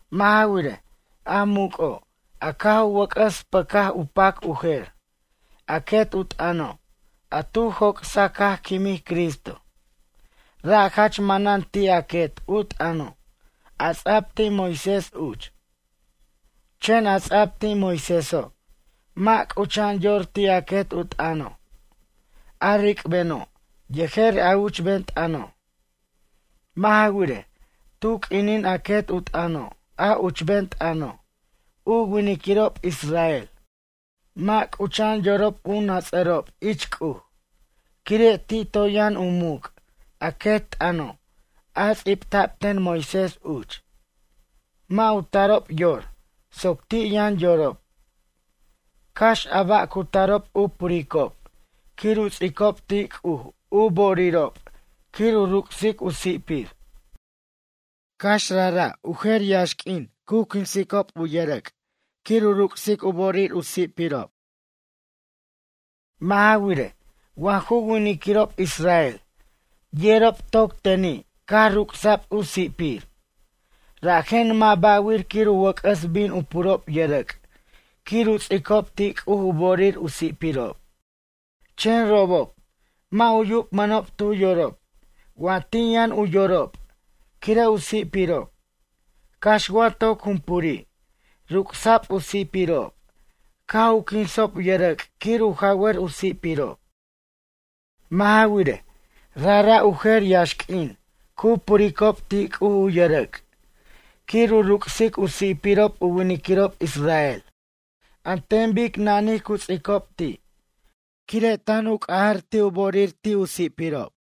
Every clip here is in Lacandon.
Mʌ' ja wirej, a muc'o', a caj u wʌc'ʌs pʌcaj pac u jer, a quet u t'ʌno', a tu joc'saj caj quimij Cristo, ra' jach manan ti' a quet u t'ʌno', a ts'ab ti' Moisés uch. Chen a ts'a'b ti' Moiséso', mʌ' c'ucha'an yor ti' a quet u t'ʌno', a ric'beno' yejer a uchben t'ʌno'. Mʌ' ja wirej, tu q'uinin a quet u t'ʌno' a uchben t'ʌno' u winiquirob israel mʌ' c'ucha'an yorob u nats'ʌrob ich C'uj, quire' ti' toy yʌn u muc' a quet t'ʌno' a ts'ibta'b ten Moisés uch. Mʌ' u tarob yor soc ti' yʌn yorob. Cax a ba' cu tarob u puricob quir u ts'icob ti' C'uj u bo'orirob quir u ruc'sic u si'pir. Cax rajra' u jer yaxq'uin cu quinsicob u ts'icob yʌrʌc' quir u ruc'sic u bo'orir u si'pirob. Mʌ' ja wirej, wa ju winiquirob israel yerob toc teni' caj ruc'sa'b u si'pir, rajen mʌ' ba'wir quir u wʌc'ʌs bin u purob yʌrʌc' quir u ts'icob ti' C'uj u bo'orir u si'pirob. Chen robob mʌ' u yubmʌnob tu yorob wa ti' yʌn u yorob quire' u si'pirob, cax wa toc jumpuri' ruc'sa'b u si'pirob caj u quinsob yʌrʌc' quir u jawʌr u si'pirob. Mʌ' ja wirej, rajra' u jer yaxq'uin cu puricob ti' C'uj u yʌrʌc' quir u ruc'sic u si'pirob u winiquirob israel an ten bic nanij cu ts'icob ti', quire' tan u c'aja ti' u bo'orir ti' u si'pirob.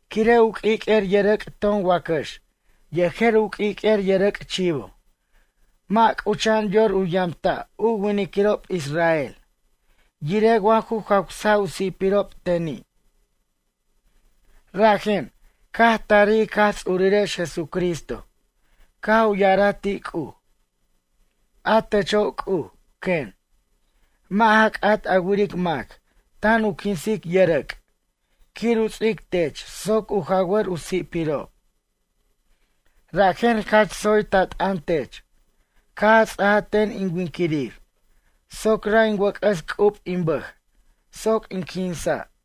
Quire' u q'uiq'uer yʌrʌc' ton wacax yejer u q'uiq'uer yʌrʌc' chivo mʌ' c'ucha'an yor u yamta' u winiquirob israel yirej wa ju jawsa' u si'pirob teni'. Rajen, caj tarij ic Jaj Ts'urirex Jesucristo caj u ya'araj ti' C'uj: A techo' C'uj, quen, mʌ' ja c'at a wiric mac tan u quinsic yʌrʌc' quir u ts'ic tech soc u jawʌr u si'pirob. Rajen jach tsoy ta t'ʌn tech caj a ts'aja ten in winquirir soc ra' in wʌc'ʌs c'ub in bʌj soc in quinsa'.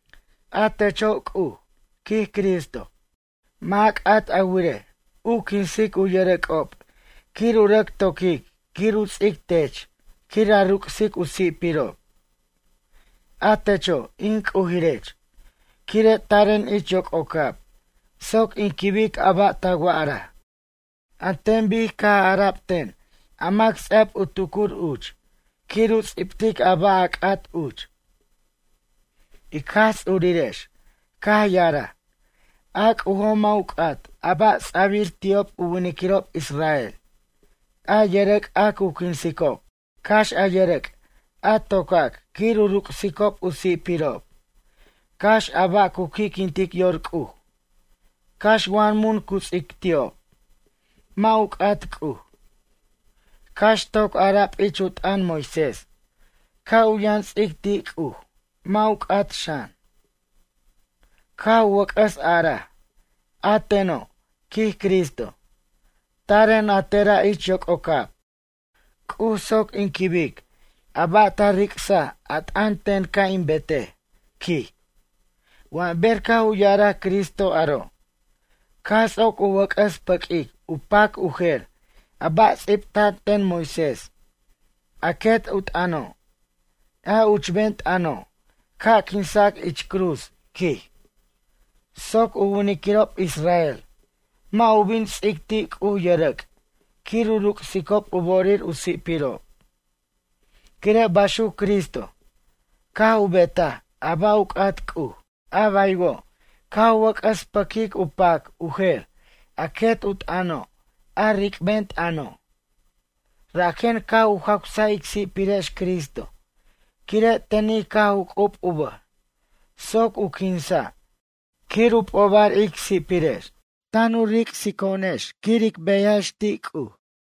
A techo' C'uj, quij Cristo, mʌ' a c'at a wirej u quinsic u yʌrʌc'ob quir u rʌc toquic quir u ts'ic tech quir a ruc'sic u si'pirob. A techo', in c'ujirech, quire' taren ich yoc'ocab soc in quibic a ba' ta wa'araj, an ten bic caj ara'b ten a mac ts'a'b u tucur uch quir u ts'ibtic a ba' a c'at uch. Ic Jaj Ts'urirex caj ya'araj, a C'ujo' mʌ' u c'at a ba' ts'a'bir ti'ob u winiquirob israel, a yʌrʌc' a cu quinsicob, cax a yʌrʌc' a tocac quir u ruc'sicob u si'pirob, cax a ba' cu qui'quintic yor C'uj, cax wa mun cu ts'ic ti'ob, mʌ' u c'at C'uj. Cax toc ara'b ich u t'ʌn Moisés ca' u yʌn ts'ic ti' C'uj mʌ' u c'at xan. Caj u wʌc'ʌs araj: “A teno', quij Cristo, taren a tera' ich yoc'ocab, C'uj soc in quibic a ba' ta ric'saj a t'ʌn ten ca' in betej”, quij. Wa ber caj u ya'araj Cristo aro', caj ts'oc u wʌc'ʌs pʌquic u pac u jer a ba' ts'ibta'an ten Moisés, a quet u t'ʌno', a uchben t'ʌno' ca' quinsa' ich cruz quij, soc u winiquirob israel mʌ' u bin ts'ic ti' C'uj yʌrʌc' quir u ruc'sicob u bo'orir u si'pirob. Quire' baxuc Cristo caj u betaj a ba' u c'at C'uj. A baywo' caj u wʌc'ʌs pʌquic u pac u jer a quet u t'ʌno' a ric'ben t'ʌno'. Rajen caj u jawsaj ic si'pirex Cristo quire' teni' caj u c'ub u bʌj soc u quinsa' quir u p'obar ic si'pirex tan u ric'sic to'onex quir ic beyajex ti' C'uj.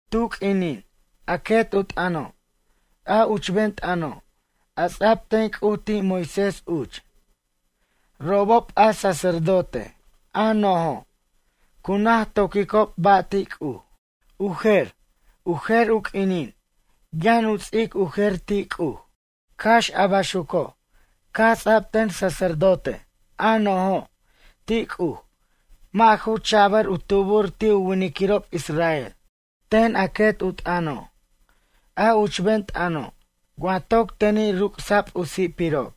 Tu q'uinin a quet u t'ʌno', a uchben t'ʌno', a ts'ab ten C'uj ti' Moisés uch, robob a sacerdote a no'jo', cu naj toquicob ba' ti' C'uj. U jer, u jer u q'uinin yʌn u ts'ic u jer ti' C'uj. Cax a baxuco' caj ts'ab ten sacerdote, a no'jo', ti' C'uj mʌ' ju cha'bʌr u tubur ti' u winiquirob israel ten a quet u t'ʌno', a uchben t'ʌno' wa toc teni' ruc'sa'b u si'pirob,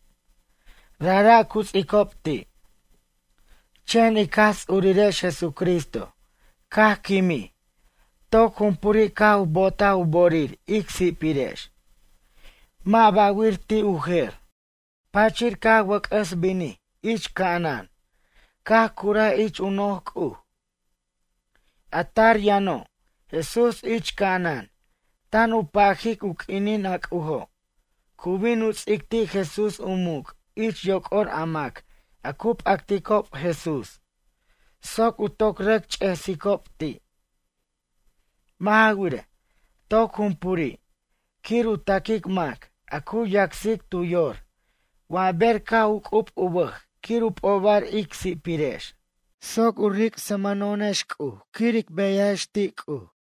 rajra' cu tsicob ti'. Chen ic Jaj Ts'urirex Jesucristo caj quimij toc jumpuri' caj u bo'otaj u bo'orir ic si'pirex, mʌ' ba'wir ti' u jer. Pachir caj u wʌc'ʌs binij ich ca'anan caj curaj ich u noj C'uj. A tar yʌno' Jesús ich ca'anan tan u pajic u q'uinin a C'ujo' cu bin u ts'ic ti' Jesús u muc' ich yoc'or a mac a cu p'acticob Jesús soc u toc rʌc ch'esicob ti'. Mʌ' ja wirej, toc jumpuri' quir u taquic mac a cu yacsic tu yor wa ber caj u c'ub u bʌj quir u p'obar ic si'pirex soc u ric'smʌno'onex C'uj quir ic beyajex ti' C'uj.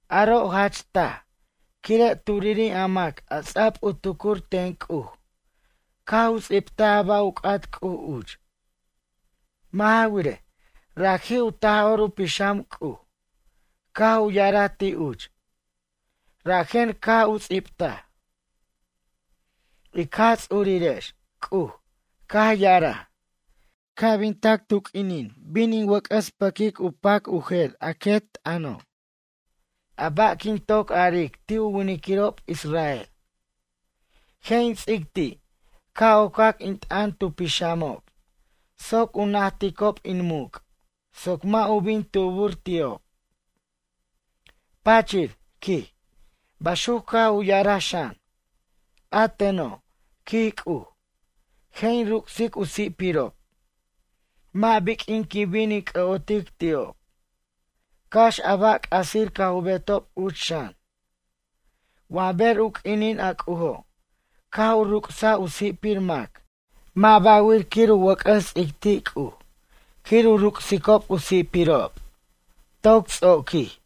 Aro' jach taj quire' turiri' a mac a ts'ab u tucur ten C'uj caj u ts'ibtaj a ba' u c'at C'uj uch. Mʌ' ja wirej, raji' u Taj'or u Pixam C'uj caj u ya'araj ti' uch. Rajen caj u ts'ibtaj: Ic Jaj Ts'urirex C'uj caj ya'araj, ca' bin tac tu q'uinin bin in wʌc'ʌs pʌquic u pac u jer quet t'ʌno' a ba' quin toc aric ti' u winiquirob israel. Je' in ts'ic ti' ca' ocac in t'ʌn tu pixamob soc u najticob in muc' soc mʌ' u bin tubur ti'ob. Pachir, quij, baxuc caj u ya'araj xan: A teno', quij C'uj, je' in ruc'sic u si'pirob. Mʌ' biq'uin quin bin in c'ʌ'otic ti'ob, cax a ba' c'asir caj u betob uch xan. Wa ber u q'uinin a C'ujo' caj u ruc'saj u si'pir mac mʌ' ba'wir quir u wʌc'ʌs ts'ic ti' C'uj quir u ruc'sicob u si'pirob. Toc ts'oquij.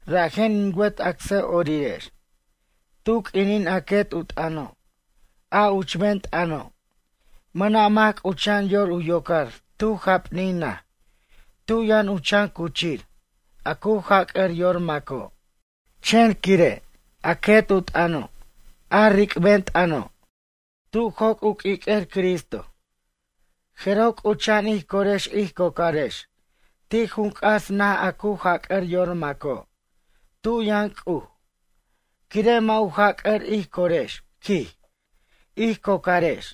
Rajen in wet acsʌ'orirex, tu q'uinin a quet u t'ʌno', a uchben t'ʌno', mʌna' mac c'ucha'an yor u yocar tu japnin naj tu yʌn u chan cuchir, a cu jac'ʌr yor maco'. Chen quire' a quet u t'ʌno', a ric'ben tʌno', tu joc' u q'uiq'uer Cristo, jeroj c'ucha'an ij corex ij cocarex ti' junc'as naj a cu jac'ʌr yor maco', tu yʌn C'uj, quire' mʌ' u jac'ʌr ij corex, quij, ij cocarex.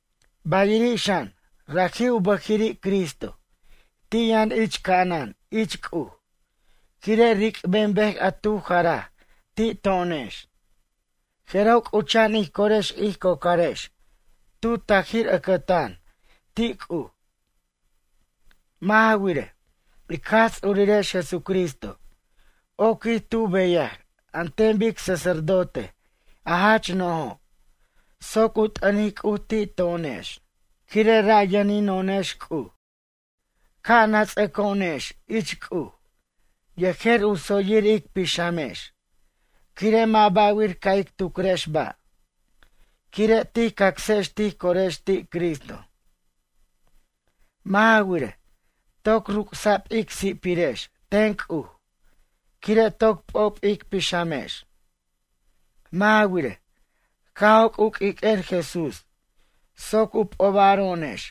Bayiri' xan, raji' u bʌjiri' Cristo ti' yʌn ich ca'anan ich C'uj, quire' ric'ben bej a tu jaraj ti' to'onex, jeroj c'ucha'an ij corex ij cocarex tu tajir ʌcʌtan ti' C'uj. Mʌ' ja wirej, ic Jaj Ts'urirex Jesucristo oquij tu beyaj an ten bic sacerdote a jach no'jo' soc u t'ʌnic C'uj ti' to'onex, quire' ra' yʌnino'onex C'uj. Ca' nats'ʌco'onex ich C'uj yejer u tsoyir ic pixamex quire' mʌ' ba'wir ca' ic tucrex ba', quire' tij cacsex tij corex ti' Cristo. Mʌ' ja wirej, toc ruc'sa'b ic si'pirex ten C'uj quire' toc p'ob ic pixamex. Mʌ' ja wirej, caj joc' u q'uiq'uer Jesús soc u p'obaro'onex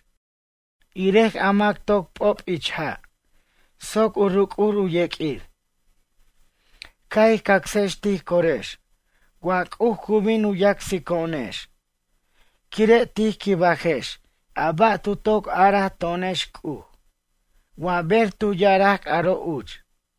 irej a mac toc p'ob ich ja' soc u ruc'ur u yeq'uir. Ca' ij cacsex tij corex wa C'uj cu bin u yacsico'onex, quire' tij quibajex a ba' tu toc araj to'onex C'uj wa ber tu ya'araj aro' uch.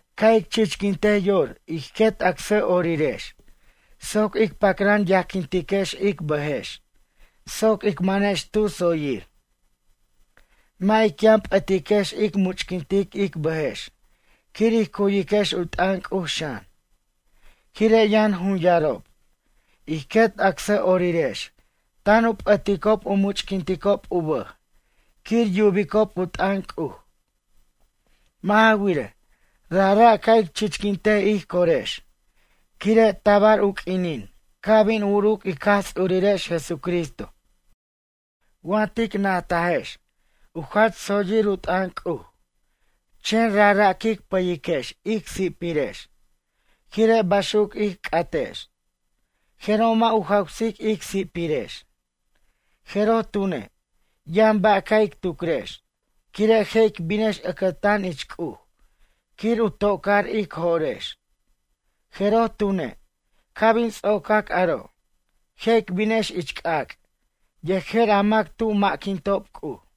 Ca' ic chichquintej yor ij quet acsʌ'orirex soc ic pacran yajquintiquex ic bʌjex soc ic manex tu tsoyir. Mʌ' ic yʌn p'ʌtiquex ic much'quintic ic bʌjex quir ij cu'yiquex u t'ʌn C'uj xan, quire' yʌn junyarob, ij quet acsʌ'orirex tan u p'ʌticob u muchq'uinticob u bʌj quir yubicob u t'ʌn C'uj. Mʌ' ja wirej, rajra' ca' ic chichquintej ij corex quire' tabar u q'uinin ca' bin uruc ic Jaj Ts'urirex Jesucristo. Wa tic najtajex u jach tsoyir u t'ʌn C'uj, chen rajra' quic pʌyiquex ic si'pirex quire' baxuc ic c'atex, jeroj mʌ' u jawsic ic si'pirex. Jeroj tune', yʌn ba' ca' ic tucrex, quire' je' ic binex ʌcʌtan ich C'uj quir u to'car ic jo'rex, jeroj tune', ca' bin ts'ocac aro', je' ic binex ich c'ac' yejer a mac tu ma'quintob C'uj.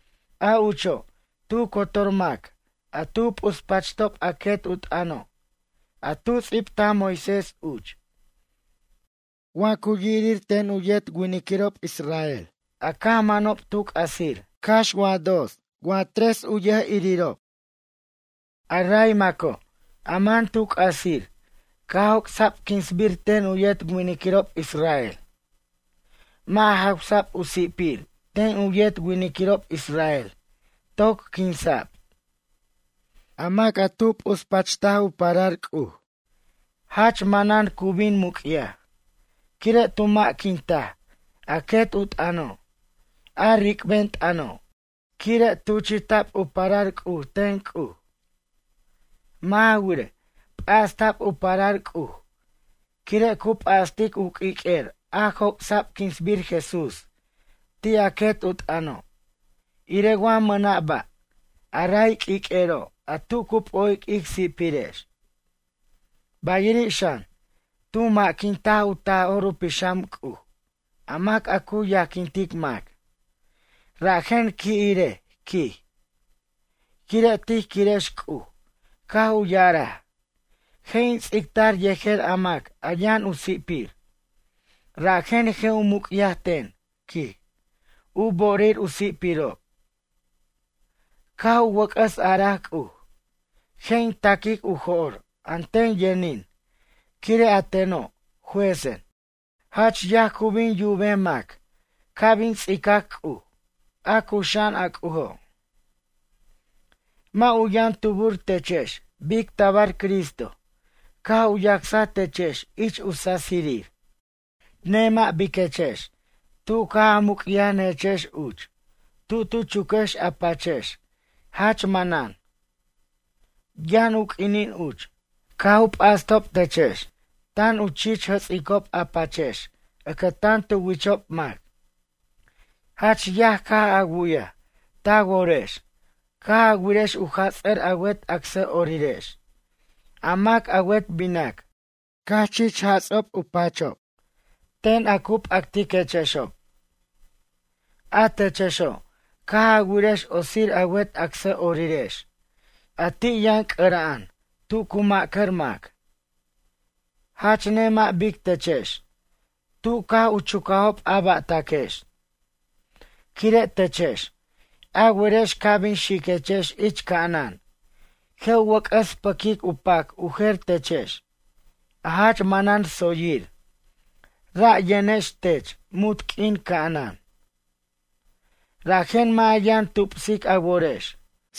A ucho' tu cotor mac a tu p'uspachtob a quet u t'ʌno', a tu ts'ibtaj Moisés uch, wa yirir ten u yet winiquirob israel a caj manob tu c'asir cax wa dos wa tres u yirob. A ray maco', a man tu c'asir caj joc'sa'b quinsbir ten u yet winiquirob israel. Mʌ' jawsa'b u si'pir ten u yet winiquirob israel toc quinsa'b. A mac a tu p'uspacht u parar C'uj, jach manan cu bin muc'yaj, quire' tu ma'quintaj a quet u t'ʌno', a ric'ben t'ʌno', quire' tuchi'ta'b u parar C'uj ten C'uj. Mʌ' ja wirej, p'asta'b u parar C'uj quire' cu p'astic u q'uiq'uer a joc'sa'b quinsbir Jesús ti' a quet u t'ʌno', irej wa mʌna' ba', a ray q'uiq'uero' a tu cu p'o'ic ic si'pirex. Bayiri' xan, tu ma'quintaj u Taj'or u Pixam C'uj a mac a cu yajquintic mac, rajen qui' irej, quij. Quire' tij quirex C'uj caj u ya'araj: “Je' in ts'ictar yejer a mac a yʌn u si'pir, rajen je' u muc'yaj ten, quij, u bo'orir u si'pirob.” Caj u wʌc'ʌs araj C'uj: “Je' in taquic u jo'r a ten yʌnin quire' a teno', juezen.” Jach yaj cu bin yubej mac ca' bin ts'icac C'uj, a cuxa'an a C'ujo'. Mʌ' u yʌn tubur techex bic tabar Cristo caj u yacsaj techex ich u sasirir. Nemʌ' biquechex tu caj a muc'yanʌjechex uch, tub tu chuquex a pachex jach manan. Yʌn u q'uinin uch, caj u p'astob techex, tan u chich jʌts'icob a pachex ʌcʌtan tu wichob mac. Jach yaj caj a wu'yaj ta worex caj a wirex u jats'ar a wet acsʌ'orirex, a mac a wet binac caj chich jats'a'b u pachob ten a cu p'actiquechexob. A techexo', caj a wirex otsir a wet acsʌ'orirex a ti' yʌn c'ʌra'an tu cu ma'cʌr mac. Jach nemʌ' bic techex tub caj u chucajob a ba'taquechex, quire' techex a werex ca' bin xiquechex ich ca'anan je' u wʌc'ʌs pʌquic pac u jer techex a jach manan tsoyir, ra' yʌnex tex munt q'uin ca'anan. Rajen mʌ' a yʌn tupsic a worex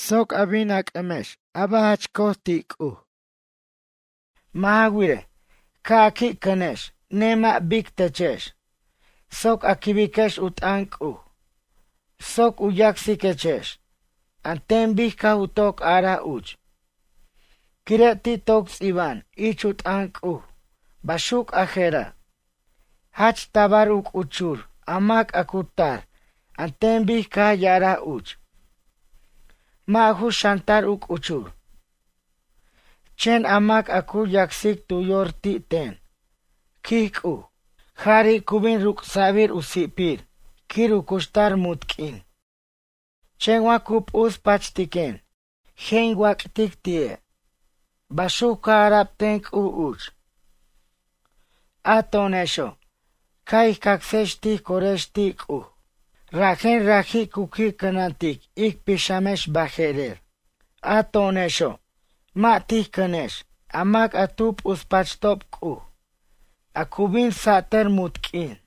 soc a bin a c'ʌmex a ba' jach co'oj ti' C'uj. Mʌ' ja wirej, ca' a qui' cʌnex nemʌ' bic techex soc a quibiquex u t'ʌn C'uj soc u yacsiquechex an ten bic caj u toc araj uch. Quire' ti' toc ts'iba'an ich u t'ʌn C'uj baxuc a je'ra': Jach tabar u c'uchur a mac a cu tar an ten bic caj ya'araj uch. Mʌ' ju xʌntar u c'uchur. Chen a mac a cu yacsic tu yor ti' ten, quij C'uj, jari' cu bin ruc'sa'bir u si'pir quir u cuxtar munt q'uin. Chen wa cu p'uspachtiquen, je' in wac'tic ti'e'. Baxuc caj ara'b ten C'uj uch. A to'onexo' caj ij cacsex tij corex ti' C'uj rajen raji' cu qui' cʌnantic ic pixamex baje'rer. A to'onexo' mʌ' tij cʌnex a mac a tu p'uspachtob C'uj a cu bin satʌr munt q'uin.